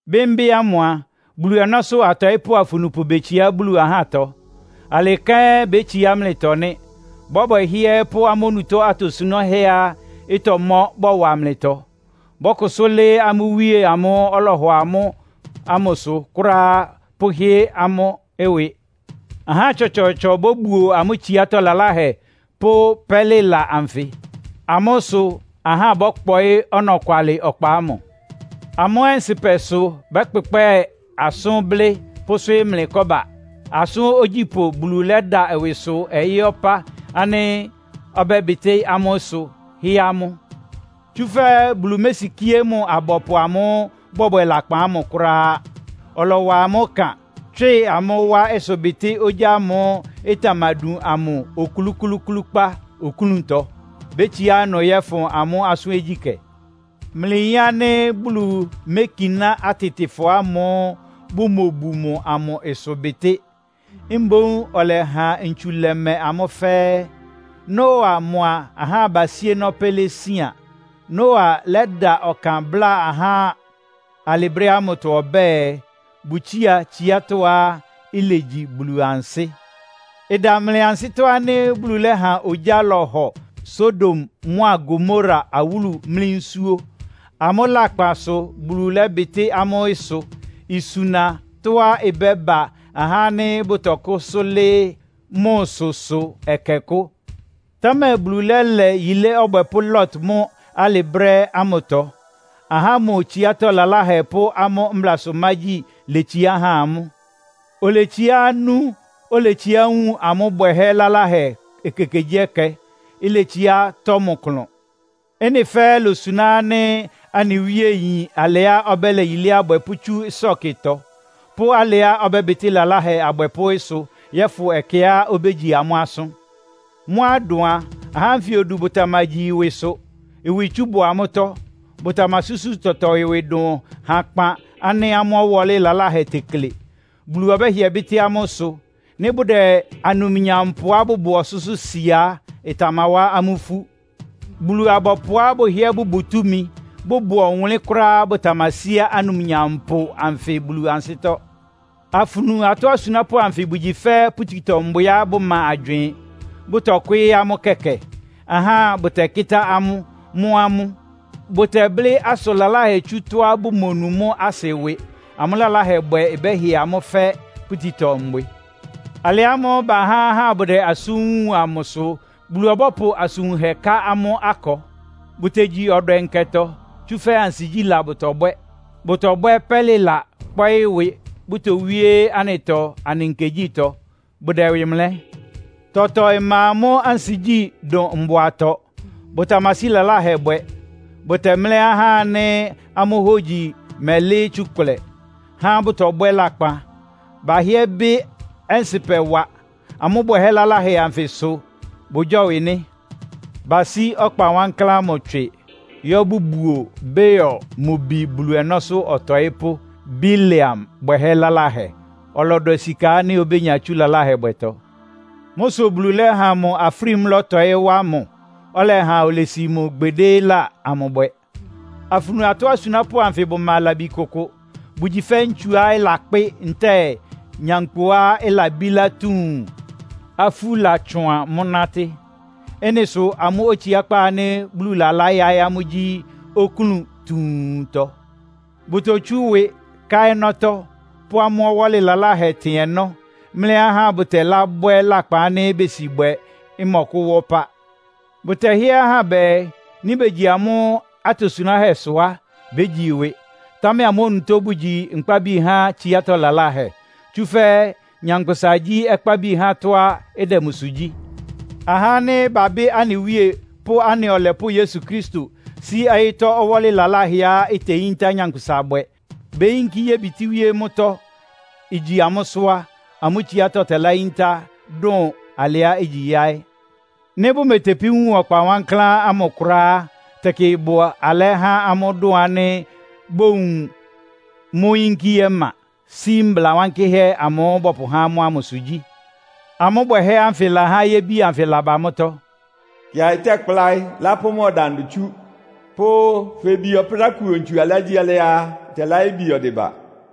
Bɩ́mbɩ́ ámʋ a, Bulu ɔnɔ́sʋ́ atɔɩ́pʋ́ afunupʋ betsiá Bulu ahátɔ. Alɩ kɛ́n bétsiá mlɩtɔ nɩ́. Bɔ́bwɛ hɩ́ɛ́ɛ́ pʋ́ amʋ́ onutó atosunáhɛ́á ɩtɔmɔ́ bɔwa mlɩtɔ. Bɔ́kʋsʋ́ lɩ́ɩ́ amʋ́ Wíe amʋ́ʋ́ ɔlɔhɔ amʋ́ ámʋsʋ kʋ́ráá, pʋ́hɩ́ amʋ́ ɩwɩ. Ahá tsɔtsɔɔtsɔ bóbuo amʋ́ tsiátɔ́ laláhɛ pʋ́ pɛ́lɩla anfɩ. Amʋ́ sʋ ahá bɔ́kpɔɩ́ ɔnɔkwalɩ ɔkpa ámʋ. Amʋ́ ɔnsɩ́pɛ sʋ bɛ́kpɛkpɛ́ɛ asʋ́n blɩ́ pʋ́swɩ́ɩ́ mlɩ kɔ́ba. Asʋ́n ogyípʋ́ Bulu lɛ́da ɩwɩsʋ ɔyɩ́ ɔpá ánɩ́ ɔbɛ́bɩtɩ́ amʋ́ ɩsʋ, hɩ́ amʋ́. Tsúfɛ́ Bulu mésikíé mʋ abɔpʋ amʋ́ʋ́ bɔbwɛ lakpan ámʋ kʋ́ráá. Ɔlɔwa amʋ́ ɩkan, tswɩ amʋ́ wá ɩsʋbɩtɩ́ ogyá ámʋ́ʋ́ ɩtamadun amʋ oklúklúúklúkpá oklúntɔ. Bétsiá ɩnʋ yɔ́fʋn amʋ́ asʋ́n ogyíkɛ́. Mlɩyin ánɩ́ Bulu mékiná atɩtɩfɔ ámʋ́ʋ́ bʋmobu mʋ amʋ ɩsʋbɩtɩ́. Mboún ɔlɛha ntsu lɛ́mɛ amʋ́ fɛ́ɛ́. Noa mʋa ahá abasíénɔ́ pɛ́ lésián. Noa lɛ́da ɔkan bláa ahá alɩ brɛ́ ámʋtɔ ɔbɛ́ɛ, bʋtsía tsiátɔ́á ilegyi Bulu ansɩ́. Ɩda mlɩ ansɩ́tɔ́ ánɩ́ Bulu lɛ́ha ogyá lɔhɔ Sodom mʋ́a Gomora awúlu mlí nsúó. Amʋ́ lakpan sʋ Bulu lɛ́bɩtɩ́ amʋ́ ɩsʋ, isuna tɔ́á ɩbɛ́ba ahá ánɩ́ bʋtɔkʋ́sʋ́ lɩ́ɩ́ mʋsʋsʋ ɛkɛkʋ́. Támɛ Bulu lɛ́lɛ yilé ɔbwɛpʋ́ Lot mʋ́ alɩ brɛ́ ámʋtɔ. Ahá ámʋ tsiátɔ́ laláhɛ pʋ́ amʋ́ mblasʋmágyi letsiá han mʋ. Oletsiá nú, oletsiá wun amʋ́ bwɛhɛ́ laláhɛ ekekegyíɛkɛ, iletsiá tɔ́ mʋ klʋn. Ɩ́nɩ fɛ́ɛ́ ilosuná ánɩ́ anɩ Wíe yin alɩá ɔbɛ́lɛ yilé abwɛpʋ́ tsú ɩsɔ́kɩtɔ, pʋ́ alɩá ɔbɛ́bɩtɩ́ lalahɛ abwɛpʋ́ ɩsʋ yɔ́fʋn ɛkɛá obégyi amʋ́ asʋ́n. Mʋ́á ɩdʋn a, ahá ánfɩ odu bʋtamagyi ɩwɩsʋ, ɩwɩtsú bʋ amʋ́tɔ́, bʋtamasúsu tɔtɔ ɩwɩ dʋn hakpan ánɩ́ amʋ́ ɔwɔ́lɩ laláhɛ tekle. Bulu ɔbɛ́hɩɛ bɩ́tɩ́ amʋ́ ɩsʋ. Nɩ́ bʋdɛ anumnyampʋá bʋbʋ ɔsʋ́sʋ́ sia á, ɩtamawá amʋ́ ifú. Bulu-abɔpʋá bʋhɩ́ɛ́ bʋbʋ túmi, bʋbʋ ɔwʋnlɩ́n kʋ́ráá bʋtamasíá anumnyampʋ anfɩ Bulu ansɩ́tɔ́. Afunu atɔ́ asunápʋ́ anfɩ bʋgyi fɛ́ pututɔ-mbwɩá bʋma agywɩɩn. Bʋtɔkwɩ́ɩ́ amʋ́ kɛkɛ, ahá bʋtɛkɩ́tá amʋ́, mɔ́ amʋ́. Bʋtɛblɩ́ asʋn laláhɛ tsú tɔ́á bʋmonu mʋ́ asɩ ɩwɩ. Amʋ́ lalahɛbwɛ bɛ́hɩ amʋ́ fɛ́ pututɔ-mbwɩ. Alɩ ámʋ́ʋ́ bahá ahá bʋdɛ asʋ́n wun amʋ sʋ Bulu ɔbɔ́pʋ asʋn wunhɛ ká amʋ́ akɔ. Bʋtegyi ɔdwɛ nkɛtɔ, tsúfɛ́ ansigyíla bʋtɔbwɛ́. Bʋtɔbwɛ́ pɛ́lɩla, kpɔ́ɩ́ ɩwɩ, bʋtowíe anɩtɔ anɩ nkegyítɔ. Bʋdɛ ɩwɩ mlɛ́. Tɔtɔ ɩma amʋ́ ansigyí dʋn mbʋatɔ. Bʋtamasí lalahɛ bwɛ. Bʋtɛmlɛ́ ahá ánɩ́ amʋ́ hógyi mɛlɩ́ɩ́ tsukʋlɛ, há bʋ́tɔbwɛ́ lakpan. Bahɩ́ɛ́ bɩ́ ɔnsɩpɛ wa. Amʋ́ bwɛhɛ́ laláhɛ anfɩ sʋ, bʋgyɔ́wɩ nɩ́! Basí ɔkpa wankláán ámʋ tswɩ, yɔ́ bʋbuo Beor mʋ bi Bulu ɔnɔ́sʋ́ ɔtɔɩ́pʋ́ Bileam bwɛhɛ́ laláhɛ. Ɔlɔdwɛ sika ánɩ́ obénya tsú lalahɛbwɛtɔ. Mʋ́ sʋ Bulu lɛ́ha mʋ afrímú lɔ́tɔɩ́ wa mʋ, ɩlɛha olesi mʋ gbedéla amʋ bwɛ. Afunu atɔ́ asunápʋ́ anfɩ bʋma labi kʋkʋ. Bʋgyi fɛ́ ntsuá ɩlakpɩ́ ntɛ́ɛ nyankpʋá ɩlabílá tuun, afú latsʋan mʋ́ nátɩ́. Ɩ́nɩ sʋ amʋ́ otsiákpá ánɩ́ Bulu lalá yáɩ́ amʋ́ gyí oklún tuuntɔ. Bʋtotsú ɩwɩ, ká ɔnɔ́tɔ́, pʋ́ amʋ́ ɔwɔ́lɩ laláhɛ tɩn ɔnɔ́, mlɛ́ ahá bʋtɛlábwɛ́ lakpan ánɩ́ besi bwɛ ɩmɔkʋ́wá ɔpá. Bʋtɛhɩ́ɛ́ ahá bɛɛ, nɩ́ begyi amʋ́ atosunáhɛ́sʋ á, bégyi ɩwɩ. Támɛ amʋ́ onutó bʋgyi nkpábi há tsiátɔ́ laláhɛ. Tsúfɛ́ nyankpʋsa gyí ɔkpábi há tɔ́á ɩdɛ mʋsʋ gyí. Ahá ánɩ́ babɩ́ anɩ Wíe pʋ́ anɩ Ɔlɛpʋ́ Yesu Kristo, sí ɔyɩ́tɔ́ ɔwɔ́lɩ laláhɛá iteyíntá nyankpʋsa bwɛ, beyinkí yébitíwíé mʋ́tɔ́, igyi amʋ́sʋ́ á, amʋ́ tsiátɔ́ tɛláyíntá dʋn alɩá igyi yáɩ́. Nɩ́ bʋmetepí wun ɔkpa wankláán ámʋ kʋ́ráá á, tɛkɩ ɩbʋ alɛ́ há amʋ́ dʋn ánɩ́ bówun mʋ́ yínkí ɔma, sí mbla wankɩ́hɛ́ amʋ́ʋ́ bɔpʋhá amʋ́ ámʋsʋ gyí. Amʋ́ bwɛhɛ́ ánfɩ lahá yébi anfɩ laba mʋ́tɔ́. “Kɩaɩ tɛ́kpláɩ́, lápʋ́ mʋ ɔdandʋ tsú” pʋ́ “Febie ɔprákuo ntsu alɩágyíalɩ́á á, ɔtɛláyébie ɔdɩba.”